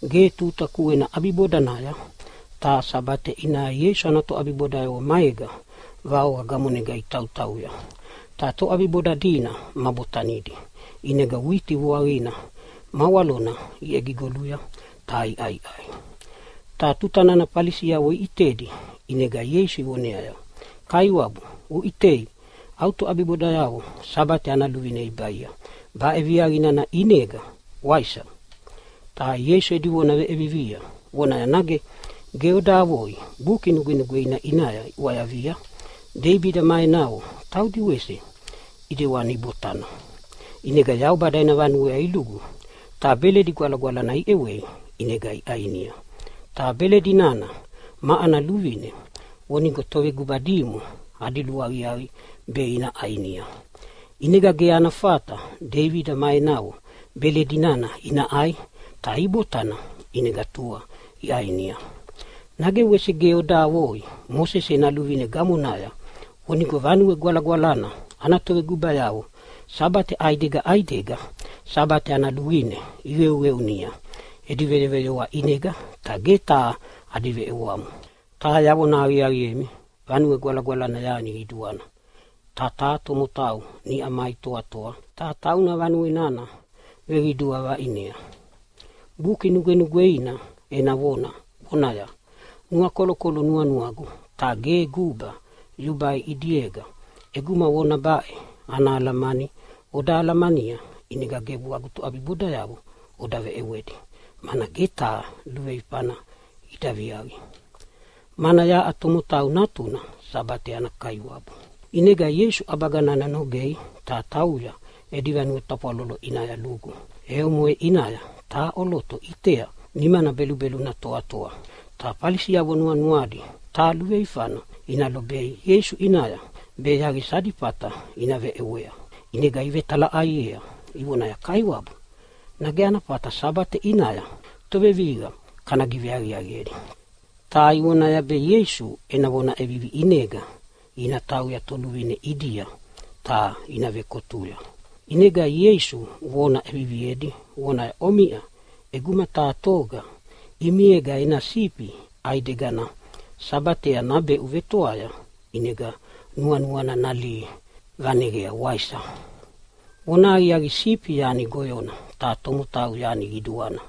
Ge tuta kuena ʼabibodanaya taha Sabate ʼinaya Ieisu ana toʼabibodayavo maega vaoqa gamonega itautauya, ta toʼabiboda dina ma botanidi ʼinega witi vuaqina ma walona iʼegigoluya ta iʼaiʼai. Ta tuta nana Falisiavo iʼitedi ʼinega Ieisu ivoneaya, “Kaiwabu uʼitei, au toʼabibodayavo Sabate ana luvine ibaia baʼe viaqa nana ʼinega, waisa?” Ta Ieisu edi vona veʼevivia vonaya, “Nage ge oda avoi Buki Nugwenugweina ʼinaya iʼwayavia, Deibida ma enavo taudi wese ʼedewani ibotana? ʼInega Yaubada ena vanuea lugu ta beledi gwalagwalana ʼewei ʼinega iʼainia, ta beledi nana ma ana luvine vonigo toveguba dimo adi luaqiaqi be ina ʼainia. ʼInega ge ana fata Deibida ma enavo beledi nana ina ʼai, ta ibotana ʼinega tua iʼainia. Nage wese ge oda avoi Mosese ena luvine gamonaya vonigo Vanue Gwalagwalana ana tovegubayavo Sabate ʼaidega ʼaidega Sabate ana luvine iqeuqeunia edi veyoveyoa ʼinega, ta ge taha adi veʼewamo? Ta yavona aqiaqiemi, Vanue Gwalagwalana yani qiduana, ta taha tomotau niʼa mai toatoa, ta tauna vanue nana veqidua vaʼinea. Buki Nugwenugweina ena vona vonaya, ‘Nuakolokolo nuanuagu ta ge guba yubai ʼidiega.’ “ʼEguma vona baʼe ana alamani oda alamania ʼinega gebu agu toʼabibodayavo oda veʼewedi, mana ge taha luveifana ida viaqi. Mana yaʼa Tomotau Natuna Sabate ana Kaiwabu.” ʼInega Ieisu ʼabaga nana nogea ta tauya edi vanue tafwalolo ʼinaya lugu. E omoʼe ʼinaya taha ʼoloto ʼitea nimana belubeluna toatoa. Ta Falisiavo nuanuadi taha luveifana ina lobea Ieisu ʼinaya, be yaqisa adi fata ina veʼewea ʼinega ivetalaʼaiea ivonaya, “Kaiwabu, nage ana fata Sabate ʼinaya tovevihiqa kana giveaqiaqiedi?” Ta ivonaya be Ieisu ena vona ʼevivi ʼinega ina tauyea toluvine ʼidia ta ina vekotuya. ʼInega Ieisu vona ʼeviviedi vonaya, “Omiʼa ʼeguma taha toga ʼimiega ena sifi ʼaidegana Sabatea nabeʼu vetoaya ʼinega nuanuana nalihi vaneyea, waisa? Vonahaqiaqi, sifi yani goyona, ta tomotau yani qiduana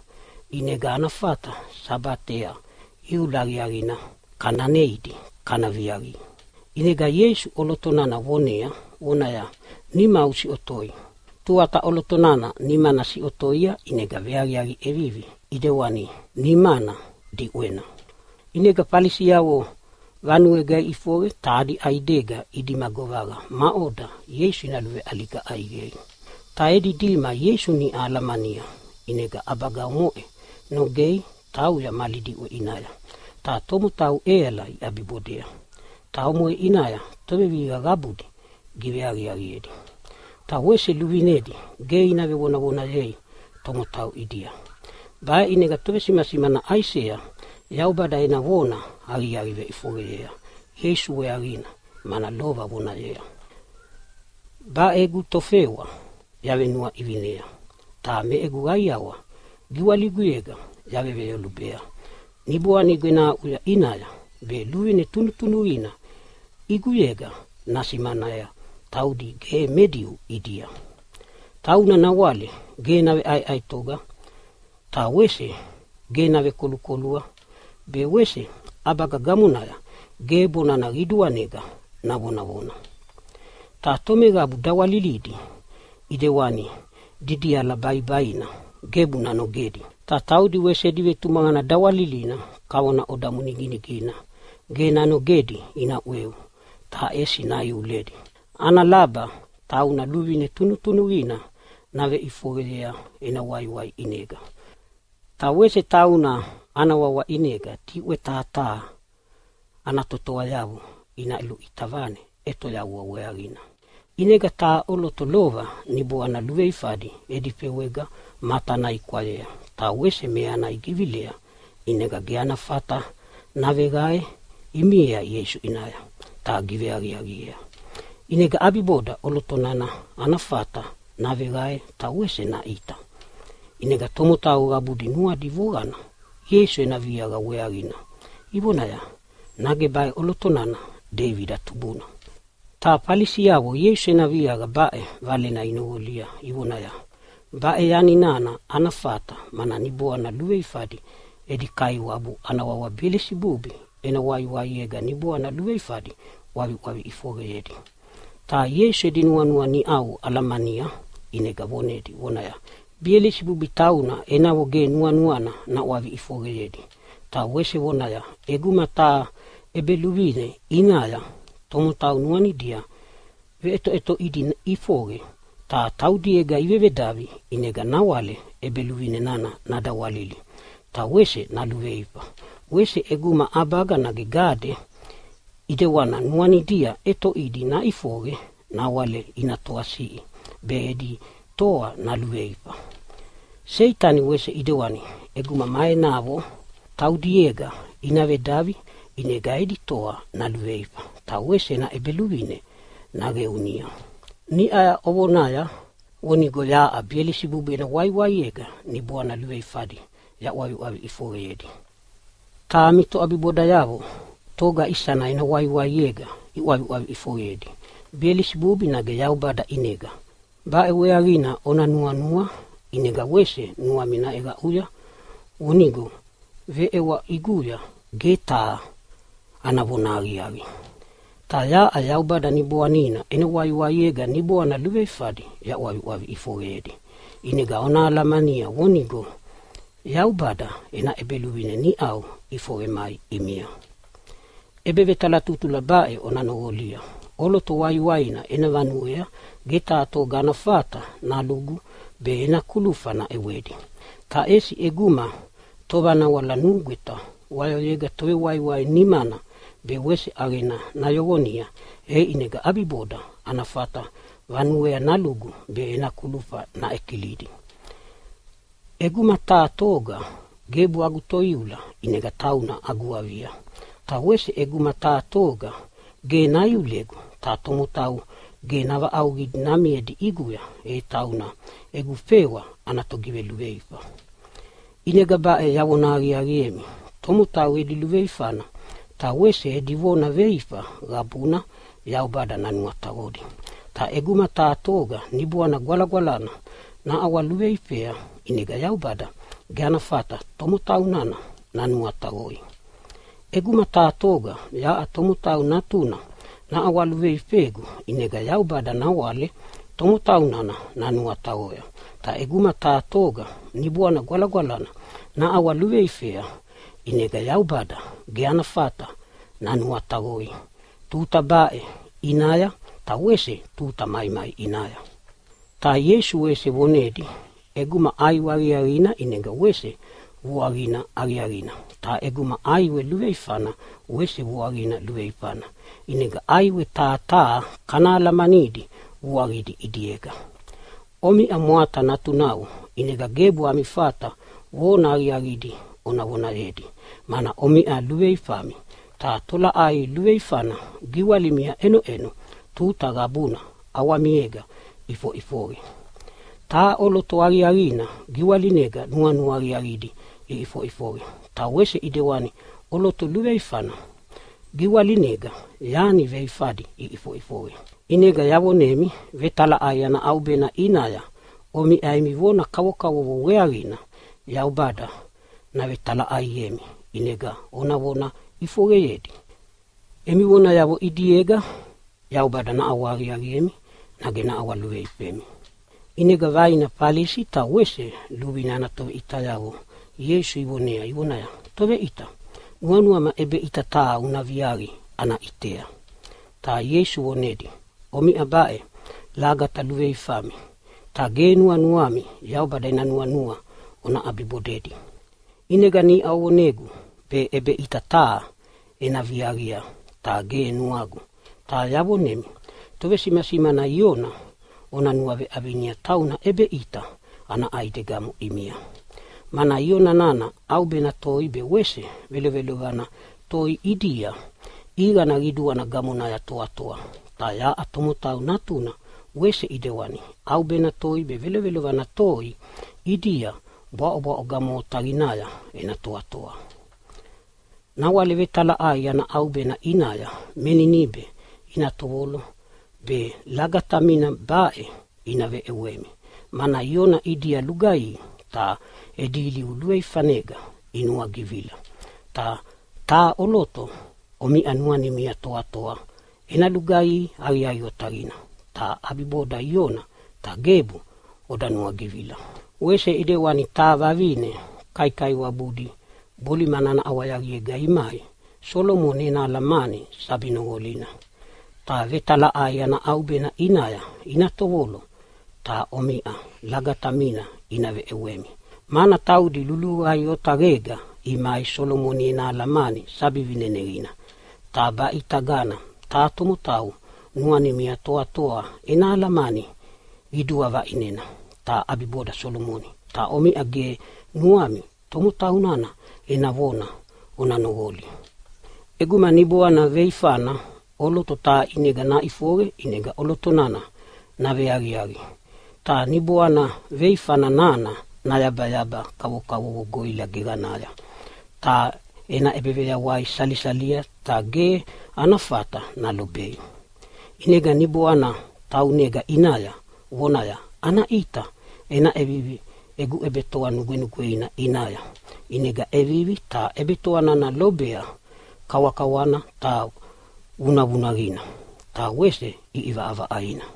ʼinega ana fata Sabatea iula aqiaqina kana neidi kana viaqi.” ʼInega Ieisu ʼoloto nana vonea vonaya, “Nimau usiʼotoi!” Tuata ʼoloto nana nimana siʼotoia ʼinega veaqiaqi ʼevivi ʼedewani nimana diʼwena. ʼInega Falisiavo vanuega iʼifoqe ta adi ʼaidega idima govaqa maʼoda Ieisu ina luveʼaliga ʼaiqei. Ta edi dima Ieisu niʼau alamania ʼinega ʼabaga omoʼe nogea tauya mali diʼwe ʼinaya. Ta tomotau ʼeala iʼabibodea, ta omoʼe ʼinaya tovevihiqa qabudi giveaqiaqiedi, ta wese luvinedi ge ina vevonavonayei tomotau ʼidia. Baʼe ʼinega tovesimasimana Aisea Yaubada ena vona ana aqiaqi veʼifoqeyea Ieisu weaqina, mana lova vonaya, “Baʼe egu Tofewa yavenuaʼivinea ta me egu qaiawa giwaliguyega yaveveyolubea. Niboanigu ena aʼuya ʼinaya, be luvine tunutunuqina ʼiguyega nasimanea taudi ge me Diu ʼidia. Tauna nawale ge naveʼaeʼaetoga ta wese ge navekolukolua, be wese ʼabaga gamonaya ge bonana qiduanega navonavona. Ta tomeqabu dawalilidi ʼidewani didiala baibaina gebu nanogedi, ta wese taudi edi vetumaqana dawalilina kavona odamu niginigina ge nanogedi ina ʼweu, ta ʼesi naiuledi, ana laba tauna luvine tunutunuqina naveʼifoqeyea ena waiwai ʼinega. Ta wese tauna ana wawa ʼinega diʼwe taha taha ana totoayavo ina luʼita vane ʼetoyavua weaqina.” ʼInega taha ʼoloto lova niboana luveifadi edi fewega matana ikwayea ta wese meana igivilea ʼinega ge ana fata naveqae imiea Ieisu ʼinaya ta giveaqiaqiea. ʼInega ʼabiboda ʼoloto nana ana fata naveqae ta wese naʼita. ʼInega tomotau qabudi nuadi voqana Ieisu ena viaqa weaqina ivonaya, “Nage baʼe ʼoloto nana Deibida tubuna?” Ta Falisiavo Ieisu ena viaqa baʼe valena inoqolia ivonaya, “Baʼe yani nana ana fata, mana niboana luveifadi edi kaiwabu ana wawa Belisibubi ena waiwaiega niboana luveifadi ʼwaviʼwavi ʼifoqeyedi.” Ta Ieisu edi nuanua niʼau alamania ʼinega vonedi vonaya, “Belisibubi tauna enavo ge nuanuana naʼwavi ʼifoqeyedi.” Ta wese vonaya, “ʼEguma taha ʼebeluvine ʼinaya tomotau nuanidia veʼetoʼetoʼidi ʼifoqe ta taudiega ivevedavi, ʼinega nawale ʼebeluvine nana nadawalili ta naluveifa. Wese ʼeguma ʼabaga nage gade ʼidewana nuanidia ʼetoʼidi naʼifoqe nawale ina toasiʼi be edi toa naluveifa. Seitani wese ʼidewana ʼeguma ma enavo taudiega ina vedavi ʼinega edi toa naluveifa ta wese ena ʼebeluvine naqeunia. Niʼa ovonaya vonigo yaʼa Belisibubi ena waiwaiega niboana luveifadi yaʼwavi ʼifoqeyedi, ta ami toʼabibodayavo togama isana ena waiwaiega iʼwaviʼwavi ʼifoqeyedi? Belisibubi ʼinega nage Yaubada ʼinega? Baʼe weaqina ona nuanua, ʼinega wese nuami naʼeqaʼuya vonigo emi veʼewa ʼiguya ge taha ana vonahaqiaqi! Ta yaʼa Yaubada Niboanina ena waiwaiega niboana luveifadi yaʼwaviʼwavi ʼifoqeyedi, ʼinega ona alamania vonigo Yaubada ena ʼEbeluvine niʼau ʼifoqe mai ʼimia. “ʼEbevetalatutula baʼe ona noqolia: ʼOloto waiwaina ena vanuea ge taha toga ana fata nalugu be ena kulufa naʼewedi. Ta ʼesi ʼeguma tovanawala nugweta wayoyega tovewaiwai nana nimana be wese ʼaqena nayoqonia, e ʼinega ʼabiboda ana fata vanuea nalugu be ena kulufa naʼekilidi. ʼEguma taha toga gebu agu toiula ʼinega tauna agu avia. Ta wese ʼeguma taha toga ge naiulegu ta tomotau ge navaʼauqidi namiedi ʼiguya, e tauna egu fewa ana togiveluveifa. “ʼInega baʼe yavona aqiaqiemi, tomotau edi luveifana ta wese edi vona veifa qabuna Yaubada nanuataqodi. Ta ʼeguma taha toga Niboana Gwalagwalana naʼawaluveifea ʼinega Yaubada ge ana fata tomotau nana nanuataqoi. ʼEguma taha toga yaʼa Tomotau Natuna naʼawaluveifegu ʼinega Yaubada nawale tomotau nana nanuataqoya. Ta ʼeguma taha toga Niboana Gwalagwalana naʼawaluveifea ʼinega Yaubada ge ana fata nanuataqoi tuta baʼe ʼinaya ta wese tuta maimai ʼinaya.” Ta Ieisu wese vonedi, “ʼEguma ʼaiwe aqiaqina ʼinega wese vuaqina aqiaqina, ta ʼeguma ʼaiwe luveifana wese vuaqina luveifana. ʼInega ʼaiwe taha taha kana alamanidi vuaqidi ʼidiega. Omiʼa mwata natunavo, ʼinega gebu ami fata vona aqiaqidi ona vonayedi mana omiʼa luveluveifami. Ta tolaʼai luveifana giwalimia ʼenoʼenova tuta qabuna ʼawamiega iʼifoʼifoqe. Taha ʼoloto aqiaqina giwalinega nuanua aqiaqidi iʼifoʼifoqe, ta wese ʼidewani ʼoloto luveifana giwalinega yani veifadi iʼifoʼifoqe. ʼInega yavonemi vetalaʼai ana ʼaubena ʼinaya omiʼa emi vona kavokavovo weaqina Yaubada navetalaʼaiemi ʼinega ona vona ʼifoqeyedi. Emi vonayavo ʼidiega Yaubada naʼawahaqiaqiemi nage naʼawaluveifemi.” ʼInega vaina Falisi ta wese luvine ana toveʼitayavo Ieisu ivonea ivonaya, “Toveʼita, nuanuama ʼebeʼita taha una viaqi ana ʼitea.” Ta Ieisu vonedi, “Omiʼa baʼe lagata luveifami, ta ge nuanuami Yaubada ena nuanua ona ʼabibodei. ʼInega niʼa ovonegu be ʼebeʼita taha ena viaqia, ta ge nuagu! Ta yavonemi tovesimasimana Iona ona nuaveʼavinia tauna ʼebeʼita ana ʼaidegamo ʼimia. Mana Iona nana ʼaubena toi be wese velovelovana toi ʼidia ʼiqana qiduana gamonaya toatoa, ta yaʼa Tomotau Natuna wese ʼidewani ʼaubena toi be velovelovana toi ʼidia bwaʼobwaʼo gamo otaqinaya ena toatoa. Nawale vetalaʼai ana ʼaubena ʼinaya me Ninibe ina tovolo be lagatamina baʼe ina veʼewemi, mana Iona ʼidia lugaihi ta edi ilivu luveifanega inuagivila, ta taha ʼoloto omiʼa nuanimia toatoa ena lugaihi aqiaqi otaqina ta ʼabiboda Iona, ta gebu oda nuagivila. “Wese ʼidewani taha vavine kaikaiwabudi bolimana ana ʼawayaqiega imai Solomoni ena alamani sabi noqolina, ta vetalaʼai ana ʼaubena ʼinaya ina tovolo ta omiʼa lagatamina ina veʼewemi, mana taudi luluvai otaqega imai Solomoni ena alamani sabi vineneqina. Ta baʼe ʼitagana taha tomotau nuanimia toatoa ena alamani qidua vaʼinena, ta ʼabiboda Solomoni. Ta omiʼa ge nuami tomotau nana ena vona ona noqoli. “ʼEguma niboana veifana ʼoloto taha ʼinega naʼifoqe, ʼinega ʼoloto nana naveaqiaqi ta niboana veifana nana nayabayaba kavokavovo goʼila geqanaya, ta ena ʼebeveyawai salisalia, ta ge ana fata nalobei. ʼInega niboana nana taunega ʼinaya vonaya, ‘Ana ʼita ena ʼevivi egu ʼebetoa nugwenugweina ʼinaya.’ ʼInega ʼevivi ta ʼebetoa nana lobea kawakawana ta vunavunaqina ta wese ʼiʼivaʼavaʼaina.